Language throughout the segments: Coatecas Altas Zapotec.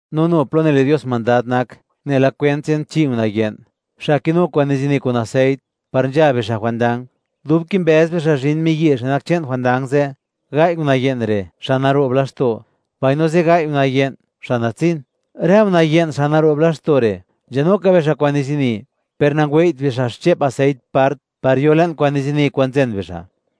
’No nu plo nile' Dios mandad nak nela kwent che'n chi' una' ye'n, xa' kinu kwa'n nizini kun aseit, par nzha bixa' jwandang. Dub kimbëz bixa' zhin miyi' xa' nak che'n jwandang ze', gai' una' ye'n re', xa' naro'b laxto', mbaino zigai' una' ye'n, xa' natsin. Rë una' ye'n, xa' naro'b laxto' re', nzhanu ka bixa' kwa'n nizini, per nangwei't bixa' xche'p aseit part par yo le'n kwa'n nizini kwa'n nzen bixa'.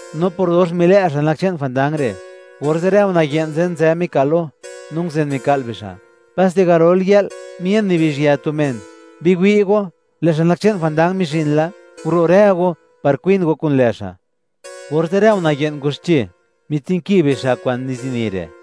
No por dox milë' xa' nak che'n jwandang re', orze' rë una' ye'n ze' nzë mika'l lo, no nguzen mika'l bixa'. Paste garol yë'l, mien nibizhyë tu men: “¡Biwi' go, lë' xa' nak che'n jwandang mizhin la! ¡Guro' rë go par kwin go kun lë' xa'!” Orze' rë una' ye'n ngwaxche, mitsinki bixa' kwa'n nizini re',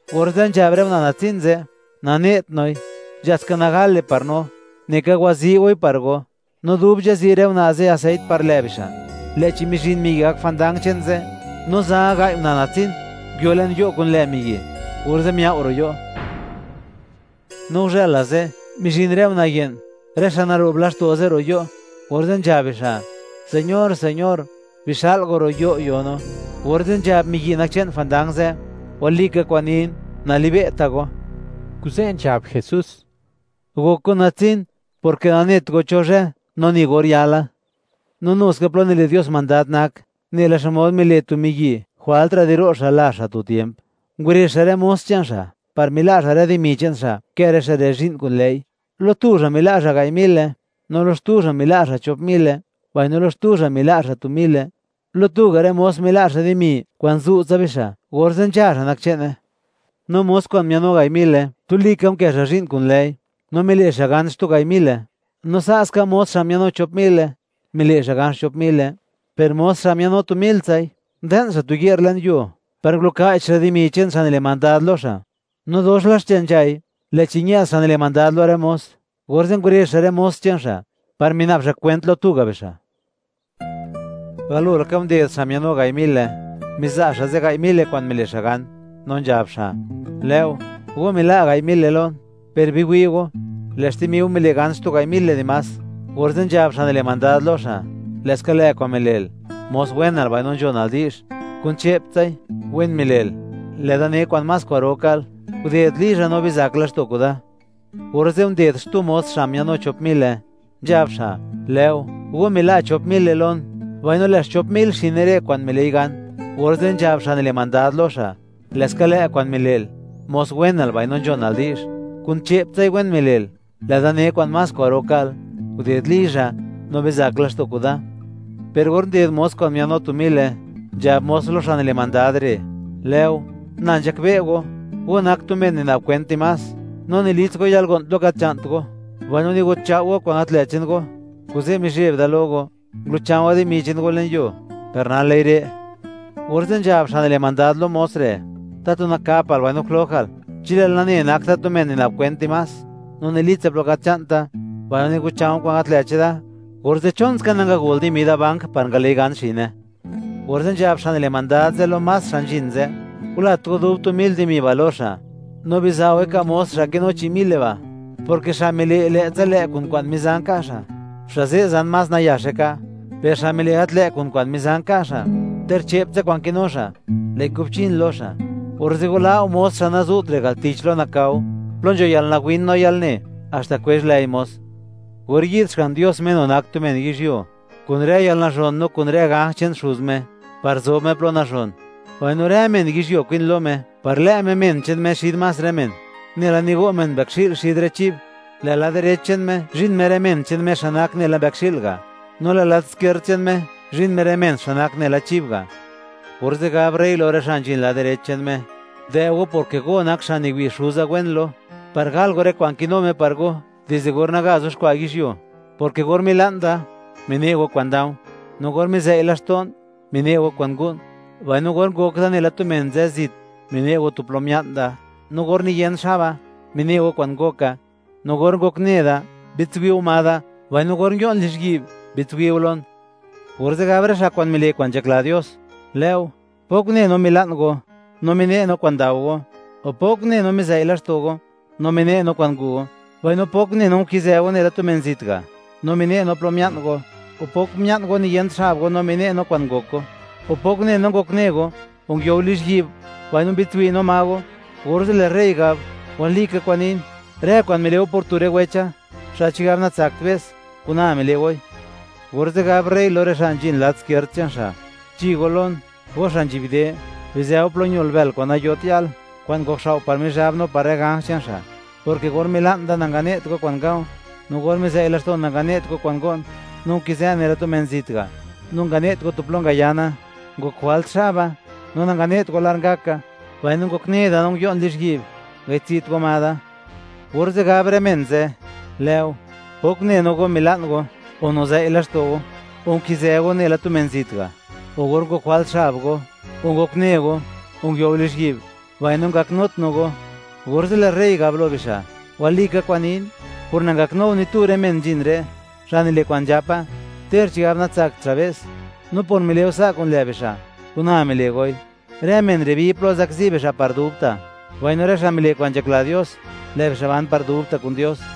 Orze' nzhab rë una' natsin ze': “Nane't noi, nzha ska nagale par no. Neka wazi' goi par go.” No dub nzhazi' rë una' ze' aseit par lë' bixa', lë'chi mizhin miyi' gak jwandang che'n ze', no za gai' una' natsin nguio le'n yo' kun lë' miyi', orze' miao' ro' yo'. No guzhëla ze', mizhin rë una' ye'n, rë xa' naro'b laxto' ze', ro' yo'; orze' nzhab bixa': “¡Señor, señor! ¡Bixa'l go ro' yo' yo no!” Orze' nzhab miyi' nak che'n jwandang ze': “Walika kwa'n nin, nalibe'ta' go.” Kuze' nzhab Jesús: ―Gok go natsin, porke nanet go cho zhë no ni or yala. ’No nu ska, plo nile' Dios mandad nak nela xmod mile' tu miyi'; jwaltra' di ro' xa' lazh xa' tu tiemp, ngurezh xa' rë mos che'n xa' par mila' xa' rë dimi che'n xa', kë rë xa' re' zhi'n kun lë'i. ’Lo tu xa' mila' xa' gai' mile, no lo xtu xa' mila' xa' chop mile, mbaino lo xtu xa' mila' xa' tu mile; lo tu ga' rë mos mila' xa' dimi kwa'n zu'tsa bixa', orze' nzha xa' nak che'ne. No mos kwa'n mia'nnu gai' mile, tuli ka unkë xa' zhi'n kun lë'i, no mile' xa' gan xtu gai' mile. No sa' ska mos xa' mia'nnu chop mile, mile' xa' gan xchop mile. Per mos xa' mia'nnu tu miltsai, nde'n xa' tu ye'r le'n yuo par nguluka'ch xa' dimi che'n xa' nile' mandad lo xa'. ’No dox la xche nzhai, lë'chi ñë'd xa' nile' mandad lo rë mos, orze' ngurezh xa' rë mos che'n xa' par mina'b xa' kwent lo tu ga' bixa'. Galo laka, nded xa' mia'nnu gai' mile, miza' xa' zigai' mile kwa'n mile' xa' gan, no nzhab xa': “Lë'o, go mila' gai' mile lon, per biwi' go, lë' xtimi go mile' gan xtu gai' mile dimás.” Orze' nzhab xa' nile' mandad lo xa': “Lë'ska lë' kwa'n mile'l, mos wenal mbaino nzhonal di'zh. Kun che'ptsai, wen mile'l; lë'da ne kwa'n más kwa'ro ka'l. Guded lizha, no bizak laxto' kuda.” Orze' nded xtu mos xa' mia'nnu chop mile, nzhab xa': “Lë'o, go mila' chop mile lon, mbaino lë' xchop mil xine re' kwa'n mile'i gan.” Orze' nzhab xa' nile' mandad lo xa': “Lë'ska lë' kwa'n mile'l, mos wenal mbaino nzhonal di'zh. Kun che'ptsai, wen mile'l; lë'da ne kwa'n más kwa'ro ka'l. Guded lizha, no bizak laxto' kuda.” Per or nded mos kwa'n mia'nnu tu mile, nzhab mos lo xa' nile' mandad re': “Lë'o, na nzhakbe' go, go nak tu men nina'b kwent dimás, no nilits go yalgo'n plo gat nzha'nt go, mbaino niguchao' go kwa'n gat lë' che'n go. Kuze', mizheb da lo go, ngulu'cha̱u̱a̱ dimi che'n go le'n yuo, per nal lë'i re'.” Orze' nzhab xa' nile' mandad lo mos re': “¡Tatu nakapal mbaino jlojal! Chi lë'l nane, nak da tu men nina'b kwent dimás, no nilitsa plo gat nzha'nta, mbaino nigucha̱o̱ kwa'n gat lë' cheda, orze', ¿chon ska nangagol dimi da bank par ngale'i gan xine?” Orze' nzhab xa' nile' mandad ze' lo más xa' nzhin ze': “Gulat go dub tu mil dimi ba' lo xa', no biza' goi ka' mos xa' kinu chi' mile ba', porke xa' mile' lë'tsa lë' kun kwa'n mizan nka' xa', xa' ze' zan más nayaxe ka'; per xa' mile' gat lë' kun kwa'n mizan nka' xa', ter che'ptsa kwa'n kinu xa', lë'i kubchin lo xa'. Orze' wala' go mos xa' nazu't re' al tich lo nakao, plo nzho yalnawin no yalne, haxta kwezh lëi mos.” ’Or yi'd Xga'n Dios, Me nu nak tu men yizhyuo, kun rë yalnazhon no kun rë ganj che'n Xuz Me, par zob Me plo nazhon, mbaino rë men yizhyuo kwin lo Me par lë' Me men che'n Me xid más rë men, nela nigo' men mbëkxi'l xid rë chib; lë' lad direch che'n Me zhin Me rë men che'n Me xa' nak nela mbëkxi'l ga', no lë' lad skierd che'n Me zhin Me rë men xa' nak nela chib ga'. Orze' gab rey lo rë xa' nzhin lad direch che'n Me: “Dë' go, porke go nak xa' niwi' Xuza wen lo, par gal go rë kwa'n kinu Me par go dizde or naga yuxkwa' yizhyuo, porke or mila'n da, mine' go kwa'n nda̱u̱; no or mizei' laxto'n, mine' go kwa'n ngu'n; mbaino or ngok da nela tu men nzë zit, mine' go tu plo mia'n da; no or niyen xaba, mine' go kwa'n ngoka; no or ngokne da, mbi'dtswi' go ma da; mbaino or nguio'n lizhyi'b, mbi'dtswi' go lon.” Orze' gab rë xa' mile' kwa'n nzhakla Dios: “Lë'o, ¿pok une no mila'n go, no mine' no kwa'n ndao go?, o, ¿pok une no, mizei' laxto' go, no mine' no kwa'n ngu' go?, mbaino, ¿pok une no nkizë go nela tu men zit ga' no mine' no tu plo mia'n go?, o, ¿pok mia'n go niyent xab go no mine' no kwa'n ngok go?, o, ¿pok une no ngokne go, o nguio go lizhyi'b, mbaino mbi'dtswi' no ma go?” Orze' lë' rey gab: “Walika kwa'n nin, rë kwa'n mile' go por tu rë wecha, xa' chigab natsakt be's, kun na mile' goi.” ’Orze' gab rey lo rë xa' nzhin lad skierd che'n Xa': “Chi go lon, go xa' nzhi'b de; bizë go plo ñol bël kwa'n nayot yal, kwa'n ngokxao' par Mizhab no par rë ganj che'n xa', porke or mila'n da, nangane't go kwa'n nga̱u̱; no or mizei' laxto'n, nangane't go kwa'n ngo'n; no nkizë'n nela tu men zit ga', no nangane't go tu plo ngayana; ngok jwalt xaba, no nangane't go lar ngaka; mbaino ngokne da no nguio'n lizhyi'b, nangayi'dtsi't go ma da.” Orze' gab rë men ze': “Lë'o, ¿pok une no go mila'n go, o nizëi' laxto' go, o nkizë go nela tu men zit ga', u or ngok jwalt xab go, o ngokne go o nguio go lizhyi'b, mbaino ngaknut no go?” Orze' lë' rey gab lo bixa': “Walika kwa'n nin, por nangaknu go ni tu rë men nzhin re', xa' nile' kwa'n nzhapa, ter chigab natsakt xa' be's, no por mile' go sa' kun lë' bixa', kuna mile' goi.” Rë men re' bi plo zakzi bixa' par dubta', mbaino rë xa' mile' kwa'n nzhakla Dios, lë' bixa' ban par dubta' kun Dios.